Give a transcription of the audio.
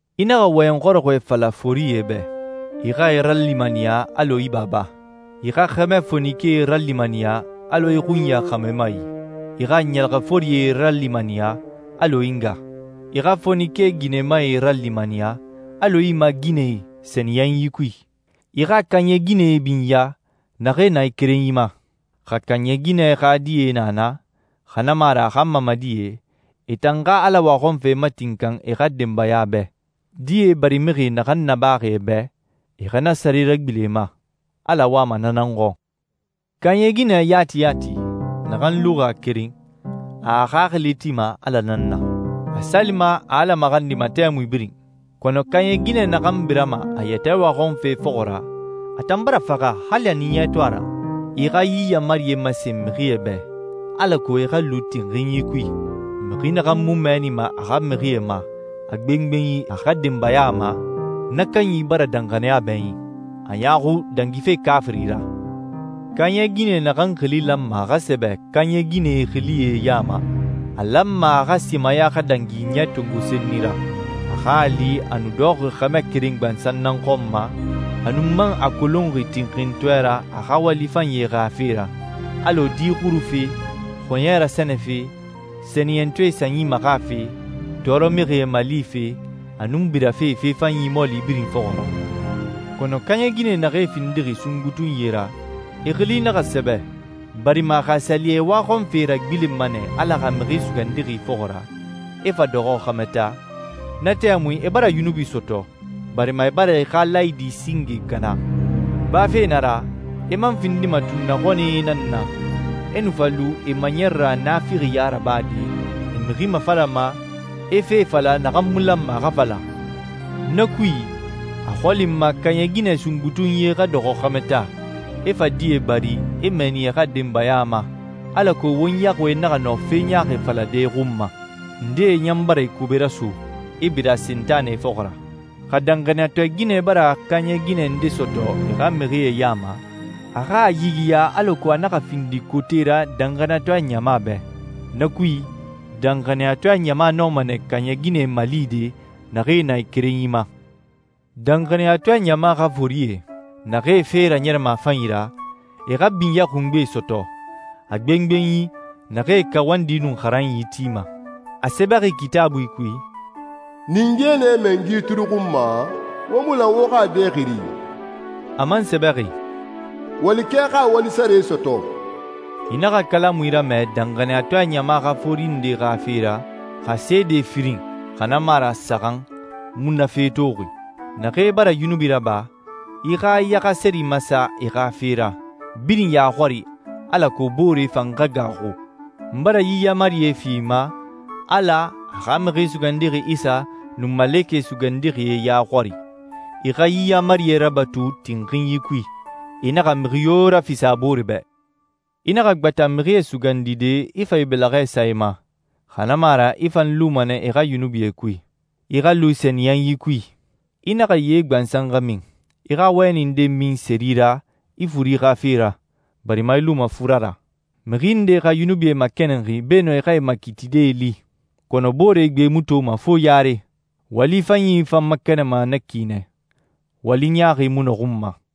I naxa wɔyɛn xɔrɔxɔɛ fala forie bɛ. I xa e ralimaniya alɔ i baba. I xa xɛmɛ fonikee ralimaniya alɔ i xunya xɛmɛmae. I xa ɲɛlɛxɛforie ralimaniya alɔ i nga. I xa fonike ginɛmae ralimaniya alɔ i maaginɛe sɛniyɛnyi kui. I xa kaaɲɛ ginɛe binya, naxee na e kerenyi ma. Xa kaaɲɛ ginɛ xa die na na, xa na mu a ra a xa mamadie, e tan xa Ala waxɔnfe matinkan e xa denbaya bɛ. Die barimixie naxan nabaxi e bɛ, e xa na sare ragbilen e ma. Ala wama na nan xɔn. Kaaɲɛ ginɛ yati yati, naxan luxi a keren, a a xaxili tima Ala nan na. A salima, a Ala maxandima tɛmui birin. Kɔnɔ kaaɲɛ ginɛ naxan birama a yɛtɛ waxɔnfe fɔxɔ ra, a tan bara faxa hali a ɲiɲɛ to a ra. I xa yi yaamarie masen mixie bɛ, alako e xa lu tinxinyi kui. Mixi naxan mu mɛɛnima a xa mixie ma, a gbengbenyi a xa denbaya ma, na kanyi bara danxaniya bɛɲin. A ɲaaxu dangife kaafiri ra. Kaaɲɛ ginɛ naxan xili lanma a xa sɛbɛ kaaɲɛ ginɛe xilie ya ma, a lanma a xa simaya xa dangi ɲɛ tongo senni ra. A xa a li a nu dɔxɔxi xɛmɛ keren gbansan nan xɔn ma, a nun man a kolonxi tinxintɔɛ ra a xa wali fanyie xa fe ra, alɔ di xurufe, xɔɲɛ rasɛnɛfe, sɛniyɛntɔɛe sanyi maxafe, tɔɔrɔmixie malife, a nun birafe fe fanyi mɔɔli birin fɔxɔ ra. Kɔnɔ kaaɲɛ ginɛ naxee findixi sungbutunyie ra, e xili naxa sɛbɛ, barima xa a sa li e waxɔnfee e ragbilenma nɛ Ala xa Mixi Sugandixi fɔxɔ ra, e fa dɔxɔ xɛmɛ taa, na tɛmui e bara yunubi sɔtɔ, barima e bara e xa laayidi singe kana. Bafe na ra, e man findima tunnaxɔnɛe nan na, e nu fa lu e maɲɛrɛ ra naafixiya rabade, e mixi mafalama, e fe fala naxan mu lanma a xa fala. Na kui, a xɔli n ma kaaɲɛ ginɛ sungbutunyie xa dɔxɔ xɛmɛ taa, e fa die bari, e mɛɛni e xa denbaya ma, alako won yaxuie naxa nɔ fe ɲaaxi falade e xun ma. Ndee ɲan bara e kobe raso, e bira Sentanɛ fɔxɔ ra. Xa danxaniyatɔɛ ginɛ bara kaaɲɛ ginɛ ndee sɔtɔ a xa mixie ya ma, a xa a yigiya alako a naxa findi kote ra danxaniyatɔɛ ɲama bɛ. Na kui, danxaniyatɔɛ ɲama nɔma nɛ kaaɲɛ ginɛe malide naxee na e kerenyi ma. Danxaniyatɔɛ ɲama xa forie, naxee fee raɲɛrɛma a fanyi ra, e xa binyɛ xungbe sɔtɔ, a gbengbenyi naxee kawandi nun xaranyi tima. A sɛbɛxi Kitaabui kui, «Ninge nɛ mɛngi turuxunma, wo mu lan wo xa a dɛ xiri.» A man sɛbɛxi, «Walikɛ xa a wali sare sɔtɔ.» I naxa kalamui ramɛ danxaniyatɔɛ ɲama xa fori nde xa fe ra, xa seede firin, xa na mu a ra saxan, mu na fe toxi. Naxee bara yunubi raba, i xa i yaxaseri masa e xa fe ra, birin ya xɔri, alako booree fan xa gaaxu. N bara yi yaamarie fi i ma, Ala, a xa Mixi Sugandixi Isa, nun malekɛ sugandixie ya xɔri. I xa yi yaamarie rabatu tinxinyi kui. I naxa mixi yo rafisa a boore bɛ. I naxa gbata mixie sugandide, i fa i bɛlɛxɛ sa e ma, xa na mu a ra i fan luma nɛ e xa yunubie kui. I xa lu sɛniyɛnyi kui. I naxa ye gbansan xa min. I xa wɛni nde min seri ra i furi xa fe ra, barima i luma fura ra. Mixi ndee xa yunubie makɛnɛnxi beenun e xa makiitide li, kɔnɔ boore gbee mu toma fo yare. Wali fanyi fan makɛnɛnma na ki nɛ, wali ɲaaxi mu nɔxunma.